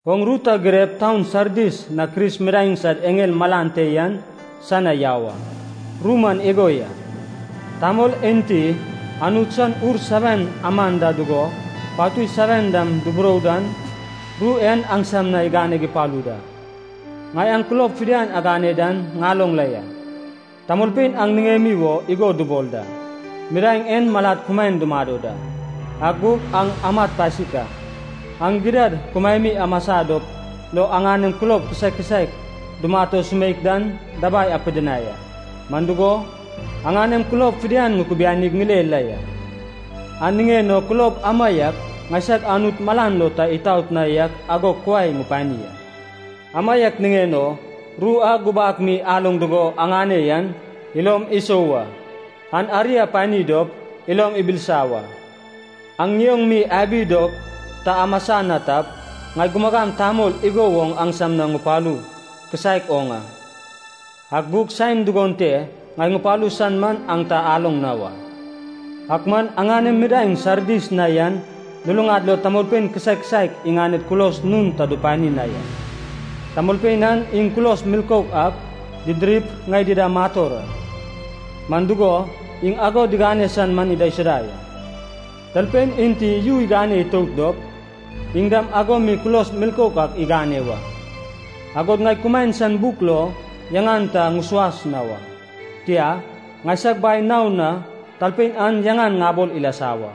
“Oŋ ru ta girep taun Sardis na Kris midaeŋ sad eŋel malan te yan san na yau a. Ru man igo ya. Tamol enti Anut san Ur seven aman da dugo patui seven dam iburou dan, ru en aŋsam na iganeg ipalu da. Ŋai aŋ kulob fidian agane dan ŋaloŋ la ya. Tamolpein aŋ niŋemi wo igo dubol da, ‘midaeŋ en malad kumaen dumado da,’ ak gug aŋ amat pasik a. Aŋ gidad kumaemi amasa dop lo aŋanem kulob kisaek kisaek dumat o sumeik dan dabai apidinai a. Man dugo, aŋanem kulob fidian ŋukubianig ŋile la ya, an niŋen o kulob amaiak ŋaisag Anut malan lo ta itaot na yak ago kuai ŋupani a. Amaiak niŋen o ru a gubak mi aloŋ dugo aŋane yan, ilom isou wa. An ari apani dop ilom ibilisa wa. Aŋ ŋioŋ mi abi dop ta amasa na tap, ŋai gumagam tamol igo woŋ aŋsam na ŋupalu kisaek oŋ a, ak gug saen dugon te ŋai ŋupalu san man aŋ ta aloŋ na wa. Ak man aŋanem midaeŋ Sardis na yan luluŋad lo tamolpein kisaek kisaek iŋaned kulos nun ta dupani na ya. Tamolpein an iŋ kulos milkouk ak didirip ŋai dida mator a, man dugo, iŋ ago digane san man idaisuda ya. Talpein enti yu igane itout dop, iŋ dam ago mi kulos milkouk ak igane wa, agod ŋai kumaen san buk lo yaŋan ta ŋusuas na wa. Tia, ŋaisag Bai naon na talpein an yaŋan ŋabol ilasa wa,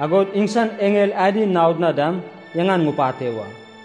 agod iŋsan eŋel adi naod na dam yaŋan ŋupate wa.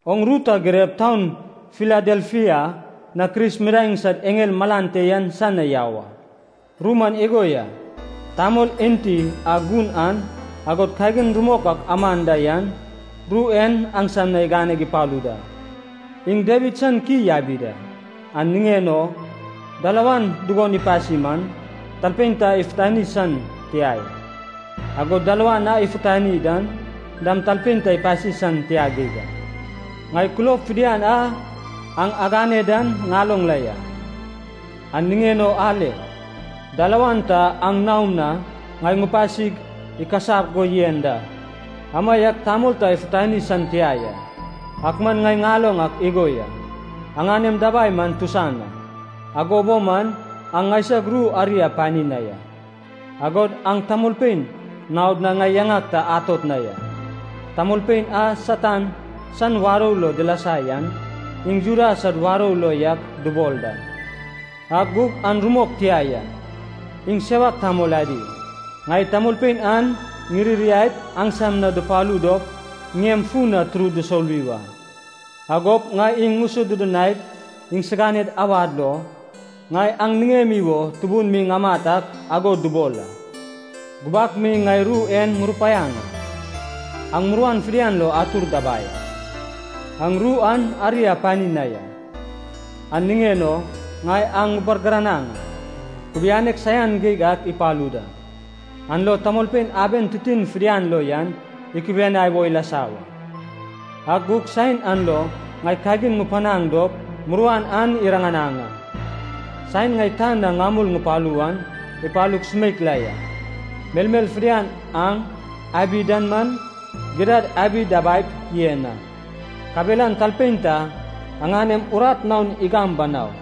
“Oŋ ru ta girep taun Filadelfia na Kris midaeŋ sad eŋel malan te yan san na yau a. Ru man igo ya. Tamol enti a gun an, agod kagin rumok ak aman da yan, ru en aŋsam na iganeg ipalu da. Iŋ Dawid san ki yabi da, an niŋen o dalawan dugon ipasi man, talpein ta ifutani san tia ya, agod dalawan a ifutani dan dam talpein ta ipasi san tia geig a. Ŋai kulob fidian a aŋ agane dan ŋaloŋ la ya. An niŋen o ale, dalawan ta aŋ naom na ŋai ŋupasig ikasap go yen da, amaiak tamol ta ifutani san tia ya. Ak man ŋai ŋaloŋ ak igo ya. Aŋanem dabai man tusan a, ago bo man aŋ ŋaisag ru ari apani na ya, agod aŋ tamolpein naod na ŋai yaŋag ta atot na ya. Tamolpein a Satan san warou lo dilasa yan, iŋ Juda sad warou lo yak dubol da, ak gug an rumok tia ya, iŋ sewak tamol adi. Ŋai tamolpein an ŋiririaip aŋsam na dupalu dop ŋiem fun na turud dusoluwi wa. Agop ŋai iŋ ŋusodudunaip iŋsiganed awad lo, ŋai aŋ niŋemi wo tubun mi ŋamat ak ago dubol a. Gubak mi ŋai ru en ŋurupaiaŋ a, aŋ muruan fidian lo atur dabai a. Aŋ ru an ari apani na ya, an niŋen o ŋai aŋ ŋubargiranaŋ a. Kubianek saian geig ak ipalu da, an lo tamolpein aben titin fidian lo yan ikubianai wo ilasa wa. Ak gug saen an lo ŋai kagin ŋupanaŋ dop muruan an iriŋanaŋ a. Saen ŋai tan na ŋamul ŋupalu wan ipalu sumeik la ya. Melmel fidian aŋ abi dan man, gidad abi dabaip yen a. Kabelan talpein ta aŋanem urat naon igam banau.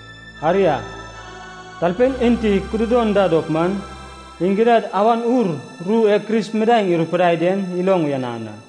Aria, talpein enti kududon da dop man, iŋ gidad Awan Ur ru e Kris midaeŋ irupidai den iloŋ uyanan a.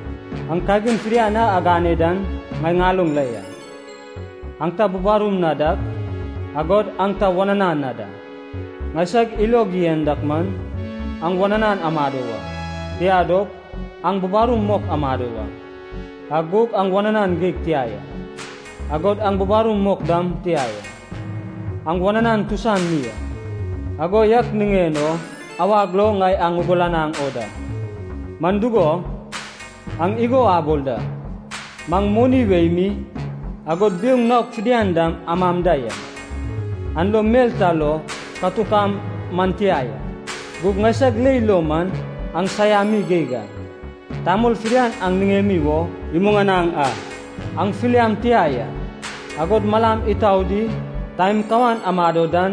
Aŋ kagin fidian a agane dan ŋai ŋaloŋ la ya. Aŋ ta bubarum na dak, agod aŋ ta wananan na da. Ŋaisag ilog yen dak man, aŋ wananan amado wa, tia dop, aŋ bubarum mok amado wa. Ak gug aŋ wananan geig tia ya, agod aŋ bubarum mok dam tia ya. Aŋ wananan tusan mi a. Ago yak niŋen o awag lo ŋai aŋ ŋugulanaŋ o da. Man dugo, aŋ igo abol da, maŋ moni wei mi, agod biouŋ naok fidian dam amam da ya, an lo mel ta lo katuk am man tia ya. Gug ŋaisag leil lo man, aŋ saiami geig a, tamol fidian aŋ niŋemi wo ilod ka imuŋanaŋ a, aŋ filiam tia ya, agod malam itau di taem kawan amado dan,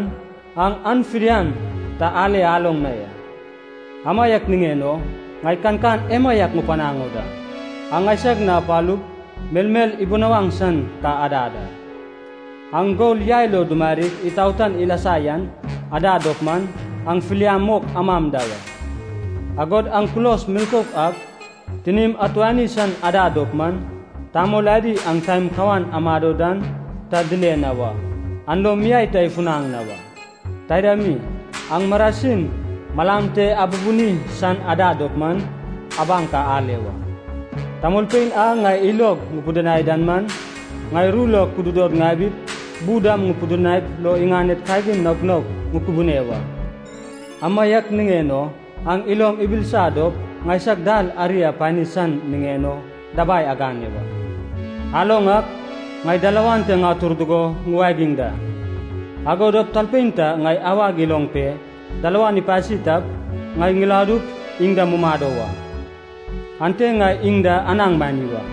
aŋ an fidian ta ale aloŋ na ya. Amaiak niŋen o ŋai kankan emaiak ŋupanaŋ o da. Aŋ ŋaisag na apalup melmel ibunawaŋ san ka adad a. Aŋ gol yai lo dumarig itaotan ilasa yan adad dop man, aŋ filiam mok amam da wa. Agod aŋ kulos milkouk ak tinim atuani san adad dop man, tamol adi aŋ taem kawan amado dan ta dile na wa, an lo miai ta ifunaŋ na wa. Taida mi, aŋ marasin malam te abubuni san adad dop man, abaŋ ka ale wa. Tamolpein a ŋai ilog ŋupidinai dan man, ŋai ru lo kududod ŋabip bu dam ŋupidinaip lo iŋaned kagin naok naok ŋukubune wa. Amaiak niŋen o aŋ ilom ibilisa dop ŋaisag dal ari apani san niŋen o dabai agane wa. Aloŋ ak, ŋai dalawan te ŋatur dugo ŋuwagiŋ da. Ago dop talpein ta ŋai awag iloŋ pe dalawan ipasi tap, ŋai ŋiladup iŋ da mumado wa. Ante ŋai iŋ da anaŋ mani wa.